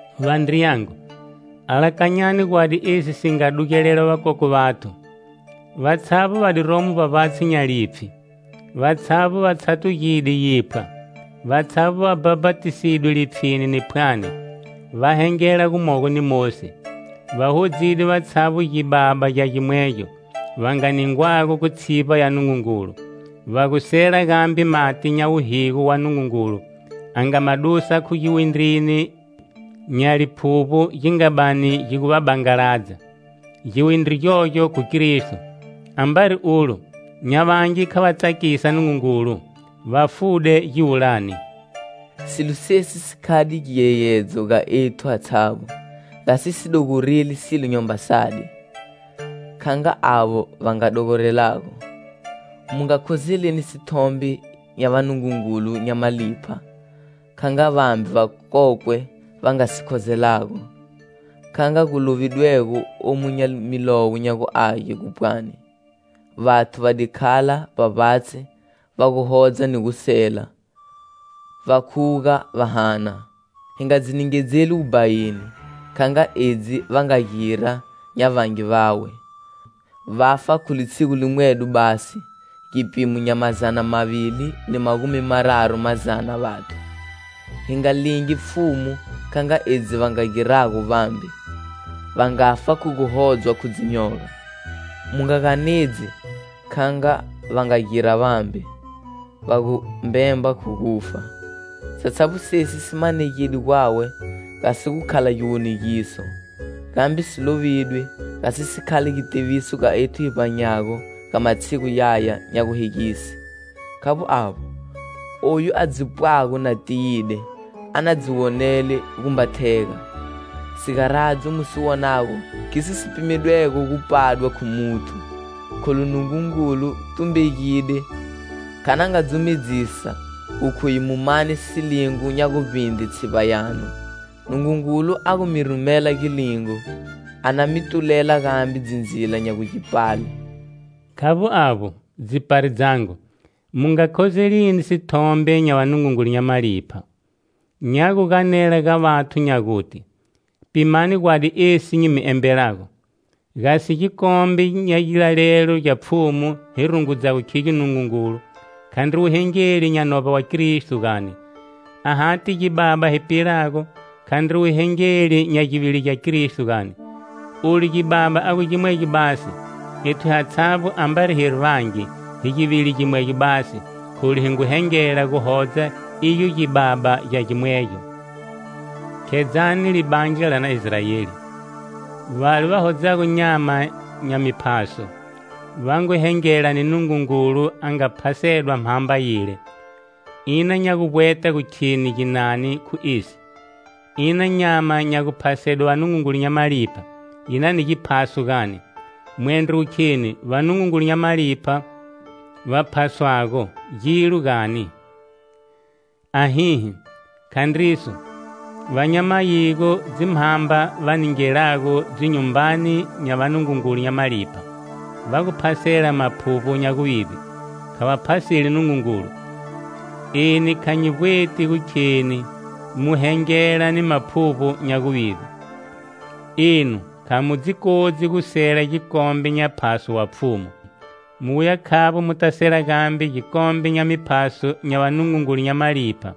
Vandriyangu, alakanyani gwadi esi si nga dugelela vakokwe vathu. Vatshavbo va diromo vbavbatshi nya lipfhi; vatshavbo va tshatugide yiphwa. Vatshavbo va bhapatisidwe lipfhini ni phwani, va hengela gumogo ni Mosi. Va hodzide vatshavbo gibaba gya gimwegyo va nga ningwago khu tshivba ya Nungungulu, va gu sela gambe mati nya wuhigo wa Nungungulu a nga ma dusa khu giwindrini nya liphuvbo gi nga bani gi gu va bangaladza, giwindri gyogyo khu Kristo. Ambari ulo, nya vangi kha va tsakisa Nungungulu, va fude giwulani. Silo sesi si khade giyeyedzo ga ethu hatshavbo, gasi hi si dogoreli silo nyamba sadi, kha nga avo va nga dogorelago. Mu nga khozelini sithombe nya vanungungulu nya malipha kha nga vambe vakokwe va nga si khozelago, kha nga gu lovidwego omu nya milowo nya gu Age gu pwani: "Vathu va di khala vbavbatshi va gu hodza ni gu sela, va khuga va hana." Hi nga dzi ningedzeli wubhayini, kha nga edzi va nga gira nya vangi vawe, va fa khu litshigu limwedo basi gipimo nya mazana mavili ni magumi mararu mazana vathu. Hi nga lingi Pfhumu kha nga edzi va nga girago vambe, va ngafa khu guhodzwa khu dzinyoga. Mu nga ganedzi, kha nga va nga gira vambe, va gu mbemba khu gufa. Satshavbo sesi si manegide gwawe gasi gu khala giwonegiso, gambe si lovidwe gasi si khale gitiviso ga ethu hi vbanyago ga matshigu yaya nya guhegise. Khavbo avbo, oyu a dzi pwago na tiyide, a na dzi wonele gumba thega. Sigaradzo mu si wonago khiso si pimedwego gu pwadwa khu muthu. Kholu Nungungulu tumbegide kha na nga dzumedzisa gu khuye mu mane silingo nya guvbindre tshivba yanu. Nungungulu a gu mi rumela gilingo, a na mi tulela gambe dzindzila nya gu gi pale. Khavbo avbo, dzipari dzangu, mu nga khozelini sithombe nya vanungungulu nya malipha. Nya gu ganela ga vathu nya guti. Pimani gwadi esi nyi mi embelago: Gasi gikombe nya gilalelo gya Pfhumu hi rungudzago khigyo Nungungulu, khandri wuhengeli nya novba wa Kristo, gani? Ahati gibaba hi pilago, khandri wuhengeli nya givili gya Kristo, gani? Olu gibaba a gu gimwegyo basi, ethu hatshavbo, ambari hiri vangi, hi givili gimwegyo basi, kholu hi ngu hengela guhodza igyo gibaba gya gimwegyo. Khedzani libandla la na Israeli. Vale va hodzago nyama nya miphaso, va ngu hengela ni Nungungulu a nga phasedwa mhamba yile. Ina nya guvbweta gu kheni ginani khu esi? Ina nyama nya guphasedwe vanungungulu nya malipha yi na ni giphaso, gani? Mwendro gu kheni vanungungulu nya malipha va phaswago gilo, gani? Ahihi, khandriso! Va nya mayigo, dzimhamba va ningelago dzinyumbani nya vanungungulu nya malipha, va gu phasela maphuvbo nya guvivbe, kha va phaseli Nungungulu. Eni kha nyi vbweti gu kheni mu hengela ni maphuvbo nya guvivbe. Enu kha mu dzi kodzi gu sela gikombe nya phaso wa Pfhumu, mu wuya khavbo muta sela gambe gikombe nya miphaso nya vanungungulu nya malipha.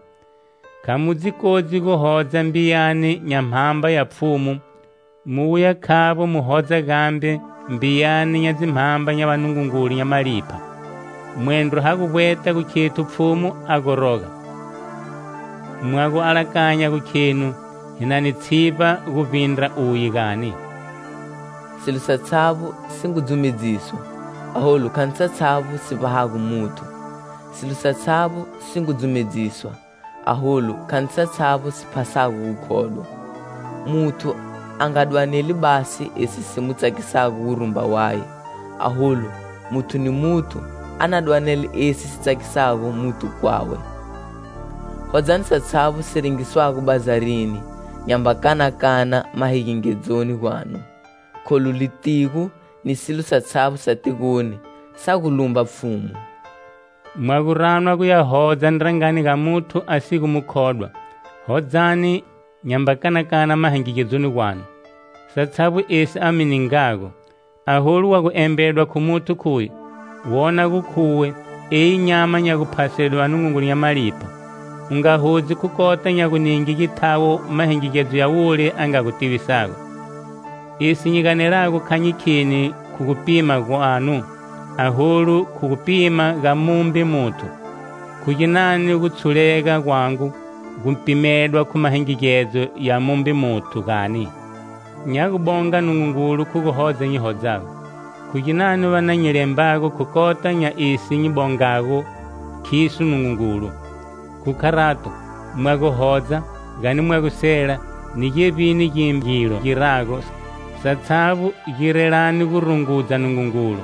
Kha mu dzi kodzi guhodza mbiyani nya Mhamba ya Pfhumu mu wuya khavbo mu hodza gambe mbiyani nya dzimhamba nya vanungungulu nya malipha. Mwendro ha gu vbweta gu khethu Pfhumu a goroga? Mwa gu alakanya gu khenu hi na ni tshivba guvbindra uye, gani? Silo satshavbo si ngu dzumedziswa, aholu khandri satshavbo si vbahago muthu; silo satshavbo si ngu dzumedziswa, aholu khandri satshavbo si phasago gukhodwa. Muthu a nga dwaneli basi esi si mu tsakisago wurumba waye, aholu muthu ni muthu a na dwanele esi si tsakisago muthu kwawe. Hodzani satshavbo si rengiswago bazarini nyamba kanakana mahingigedzoni gwanu, kholu litigo ni silo satshavbo sa tigoni sa gu lumba Pfhumu. Mwa gu ranwa guya hodza ndrangani ga muthu a si gu mukhodwa, hodzani, nyamba kanakana mahingigedzoni gwanu, satshavbo esi a mi ningago. Aholu wa gu embedwa khu muthu khuye: "Wona gu khuwe eyi nyama nya guphasedwe vanungungulu nya malipha," u nga hodzi khu kota nya guninge githawo mahingigedzo ya wule a nga gu tivisa. Esi nyi ganelago kha nyi kheni khu gupima gwanu, aholu khu gupima ga mumbe muthu. Khu ginani gutshulega gwangu gu pimedwa khu mahingigedzo ya mumbe muthu, gani? Nya gu bonga Nungungulu khu guhodza nyi hodzago, khu ginani va na nyi lembago khu kota nya esi nyi bongago khiso Nungungulu? Khu kharato, mwa gu hodza, gani mwa gu sela, ni gevbini gimbe gilo mu girago, satshavbo girelani gu rungudza Nungungulu.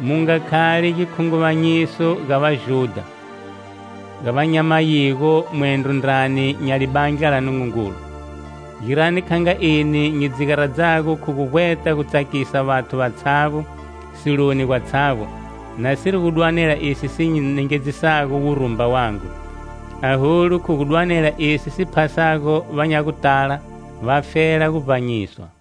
Mu nga khali gikhunguvanyiso ga Vajudha, ga va nya mayigo mwendro ndrani nya libandla la Nungungulu. Girani kha nga eni nyi dzi garadzago khu gu vbweta gutsakisa vathu vatshavbo, siloni gwatshavbo, nasiri gu dwanela esi si nyi nengedzisago wurumba wangu, aholu khu gu dwanela esi si phasago va nya gutala, vafela gu vbanyiswa.